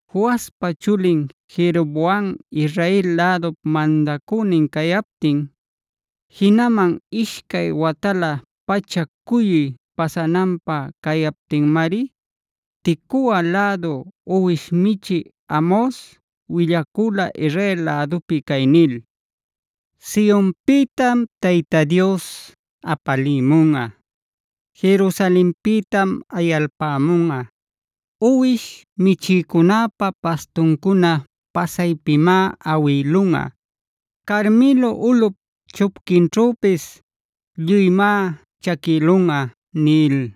Joaspa chulin Jeroboamb Israel lädup mandacünin cayaptin, jinaman ishcay watalä pacha cuyuy pasananpä cayaptinmari Tecoa lädu uwish michï Amos willacula Israel lädupi cay nil: “Sionpïtam Tayta Dios apalimunꞌa; Jerusalenpïtam ayalpamunꞌa.c Uwish michïcunäpa pastuncuna pasaypimá awïlunꞌa; Carmelo ulꞌup chupquinćhüpisd lluymá chaquïlunꞌa” nil.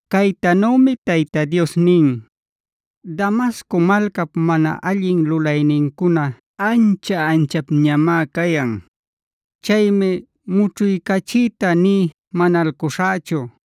Caytanümi Tayta Dios nin: “Damasco malcap mana allin lulaynincuna ancha-anchapñamá cayan.e Chaymi mućhuycachiyta nï manalcuśhächu.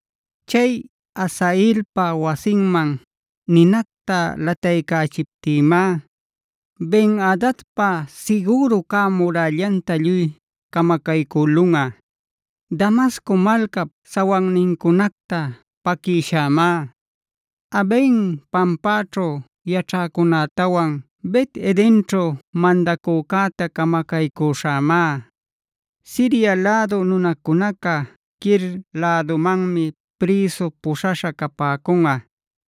Chay Hazaelpa wasinman ninacta lataycächiptïmá Ben-adadpa sigüru cä murällanta lluy camacaycülunꞌa. Damasco malcap sawannincunacta paquïshämá. Aven pampaćhu yaćhäcunätawan Bet-edenćhu mandacücäta camacaycüśhämá. Siria lädu nunacunaca Kir lädumanmi prïsu puśhaśha capäcunꞌa.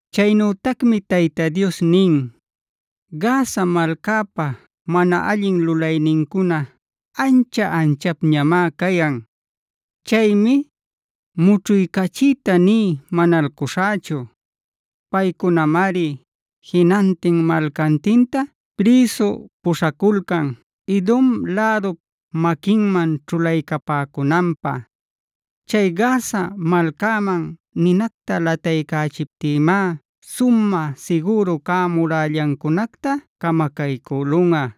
Chaynütacmi Tayta Dios nin: “Gaza malcapa, mana allin lulaynincuna ancha-anchapñamá cayan. Chaymi mućhuycachiyta nï manalcuśhächu. Paycunamari jinantin malcantinta prïsu puśhaculcan Edom lädup maquinman ćhulaycapäcunanpä. Chay Gaza malcaman ninacta lataycächiptïmá sumä sigüru cä murällancunacta camacaycülunꞌa.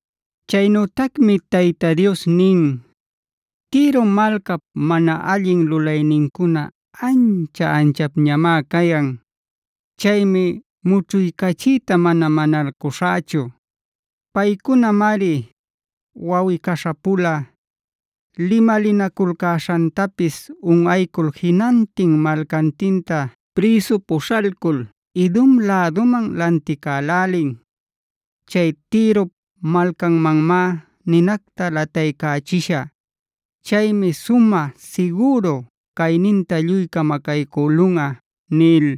Chaynütacmi Tayta Dios nin: “Tiro malcap mana allin lulaynincuna ancha-anchapñamá cayan.i Chaymi mućhuycachiyta mana manalcuśhächu. Paycunamari wawꞌi-caśha-pula limalinaculcäśhantapis unꞌaycul jinantin malcantinta prïsu puśhalcul Edom läduman lanticälälin. Chay Tirop malcamanmá ninacta lataycächishä. Chaymi sumä sigüru cayninta lluy camacaycülunꞌa” nil.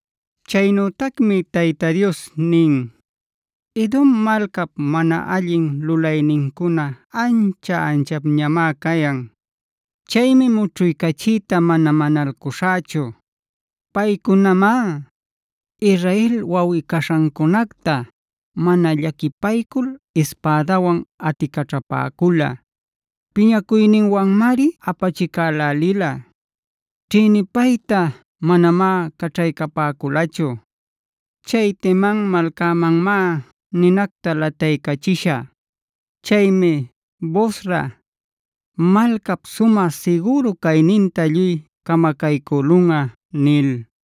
Chaynütacmi Tayta Dios nin: “Edom malcap mana allin lulaynincuna ancha-anchapñamá cayan.j Chaymi mućhuycachiyta mana manalcuśhächu. Paycunamá Israel wawꞌi-caśhancunacta mana llaquipaycul ispädawan aticaćhapäcula. Piñacuyninwanmari apachicälälila; ćhïnipayta manamá caćhaycapäculachu. Chay Teman malcamanmá ninacta lataycächishä. Chaymi Bosra malcap sumä sigüru cayninta lluy camacaycülunꞌa” nil.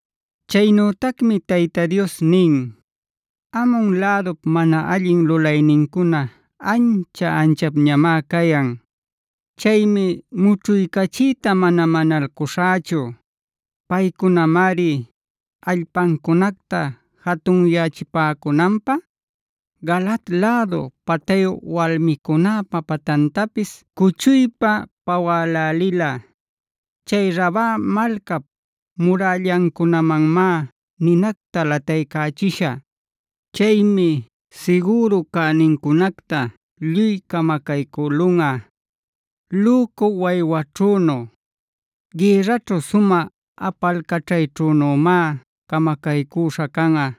Chaynütacmi Tayta Dios nin: “Amon lädup mana allin lulaynincuna ancha-anchapñamá cayan.k Chaymi mućhuycachiyta mana manalcuśhächu. Paycunamari allpancunacta jatunyachipäcunanpä Galaad lädu patayu walmicunäpa patantapis cuchuypa pawälälila. Chay Raba malcap murällancunamanmá ninacta lataycächishä. Chaymi sigüru cänincunacta lluy camacaycülunꞌa. Lücu waywaćhünu, gïrraćhu sumä apalcaćhayćhünümá camacaycüśha canꞌa.